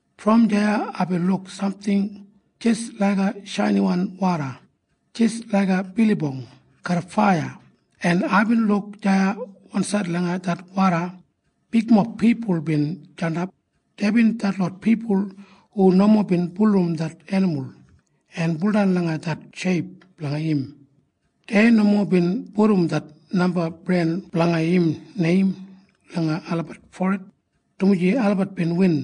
Brom deya aibin luk samting jis laiga shainiwan woda, jis laiga bilibong garram faiya, en aibin luk deya wansaid langa det woda bigmob pipul bin jandap. Deibin detlot pipul hu nomo bin bulurrum det enimul en buldan langa det sheip blanga im. Dei nomo bin pudum det namba bren blanga im neim langa olabat forid, dumaji olabat bin win.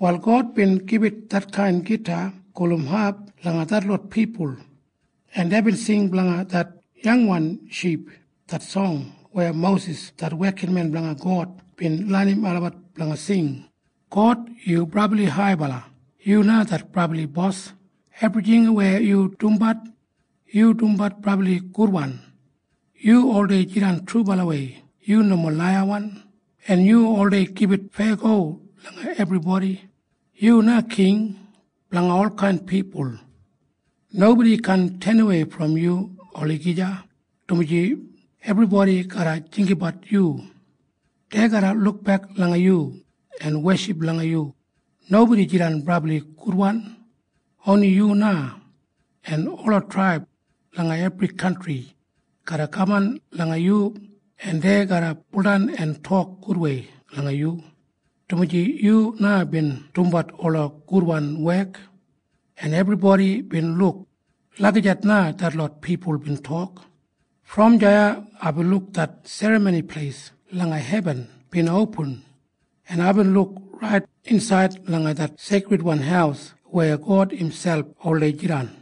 Wal God bin gibit detkain gita gulum hap langa detlot pipul, en deibin sing blanga det yangwan ship, det song weya Mosis det wekinmen blanga God bin lenim olabat blanga sing, “God, yu brabli haibala. Yu na det Brabli Bos. Ebrijing weya yu dumbat, yu dumbat brabli gudwan. Yu oldei jidan trubalawei. Yu nomo laiyawan. En yu oldei gibit feyago langa ebribodi. Yu na king blanga olkain pipul. Nobodi kaan tenawei brom yu olagija, dumaji ebribodi garra jinggabat yu. Dei garra lukbek langa yu en weship langa yu. Nobodi jidan brabli gudwan. Oni yu na. En ola traib langa ebri kantri garra kaman langa yu, en dei garra baudan en tok gudwei langa yu, dumaji yu na bin dumbat ola gudwan wek, en ebribodi bin luk.” Lagijat na detlot pipul bin tok. Brom deya aibin luk det serramoni pleis langa hebin bin opin, en aibin luk rait insaid langa det Seikridwan Haus weya God imselp oldei jidan.